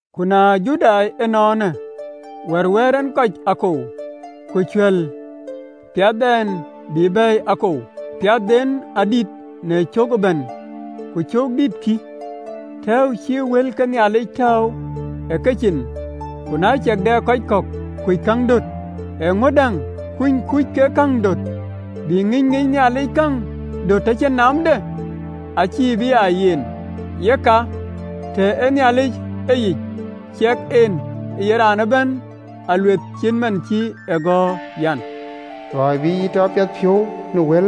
Ku na Judai ënɔɔnë, wär wɛ̈ɛ̈r en kɔc akuöc? Ku cuɛ̈l, piathdɛn bï bɛ̈ɛ̈i akou? Piathden adït në cök ëbɛ̈n. Ku cöök dït, kï, tɛ̈ɛ̈u cï wël ke Nhialic tääu ë Judai cin. Ku na ciɛk dɛ kɔc kɔ̈k kuc käŋ döt, eeŋö däŋ? Kuny kuc kek käŋ döt, bï ŋïny ŋicë Nhialic käŋ döt tɔ cïn naamde? (LXX). Acï bï aa yen! Yeka, tɔ Nhialic ee yic, ciɛk an, ye raan ëbɛ̈n alueeth, acït man cï e gɔ̈ɔ̈r an: “Luɔi bï yï tɔ piɛthpiɔ̈u në wël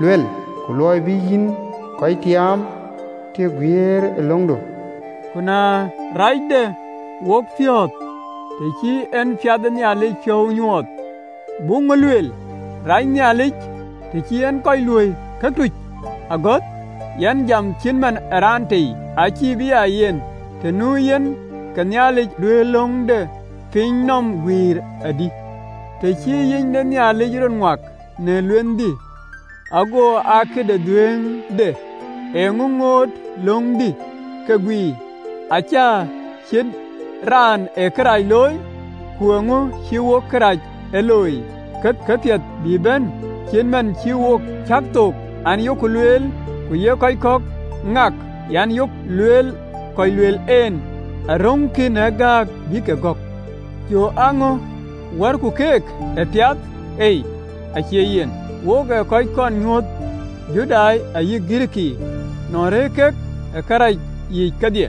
lueel, Ku luɔi bï yïn kɔc tiaam të guiirë löŋdu.” Ku na rac de wopiɔ̈ɔ̈th, të cï en piath ë Nhialic piɔ̈u nyuɔɔth, buk ŋö lueel? Rac Nhialic, të cï en kɔc luöi këtuc ë agɔ̈th? (Yɛn jam cït man ë raan tei.) Acï bï aa yen! Të nu yen, ke Nhialic duëër löŋ de piny nɔm guiir adï? Të cï yic de Nhialic rɔt ŋuak në luenhdï, ago aa këde dhuëëŋde, eeŋö ŋootë löŋdï ke guiir, acä ciët raan ë kërac looi? Ku eeŋö cïï wok kërac ee looi, ke këpiɛth bï bɛ̈n? Cït man cï wo cäk thook, an, yok lueel, ku ye kɔc kɔ̈k ŋak an, Yok lueel. Kɔc luel en aröŋkï në gääk bï ke gɔ̈k. Jɔ aa ŋö? Wärkï keek ë piath? Ei, acie yen! Wok ë kɔc kɔn nyuööth, Judai ayï Girikii, nɔn rëër kek ë këracic kedhie.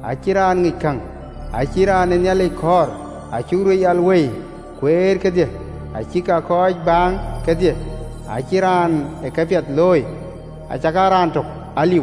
Acïn raan ŋic käŋ, acïn raan ee Nhialic kɔɔr, Acïk röt yal wei kueer kedhie, acïk aa kɔc baaŋ kedhie, Acïn raan ë këpiɛth looi, acakaa raan tök aliu.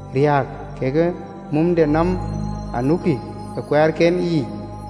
Riääk kekë mumdenɔm anukï ë kuɛɛrken yiic,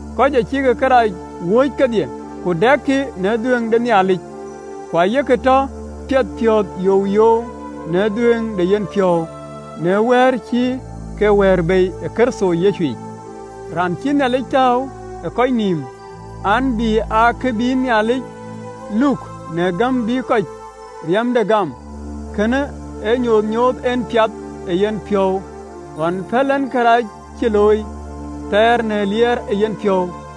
kɔc acïk kërac wööc kedhie, ku dɛkï në dhuëëŋ de Nhialic. Ku aye ke tɔ piɛthpiɔ̈ɔ̈th youyou në dhuëëŋ de yenpiɔ̈u në wëër cï ke wɛ̈ɛ̈r bei ë Kërtho Yecu yic, raan cïï Nhialic tääu ë kɔc nïïm an, bï aa kë bï Nhialic luk, në gäm bï kɔc riɛmde gam. Kënë ee nyuöth nyooth en piath ë yenpiɔ̈u, ɣɔn pɛ̈l en karɛc cï looi thɛɛr, në liɛɛr ë yenpiɔ̈u,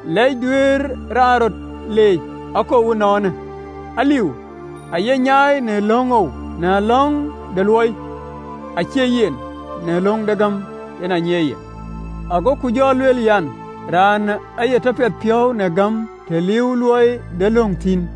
Lɛc duëër raan rɔt leec akou ënɔɔnë? Aliu, aye nyai. Në löŋou? Në löŋ de luɔi? Acie yen, në löŋ de gäm, yen aa nyiɛɛiyë ye. Agoku jɔ lueel an, Raan aye tɔ piɛthpiɔ̈u në gäm, të liiuwë luɔi de löŋ thïn.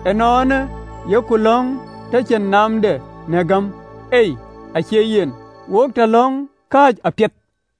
Ënɔɔnë, yok löŋ tɔ cïn naamde në gäm? Ei! Acie yen, wok tɔ löŋ kääc apiɛth.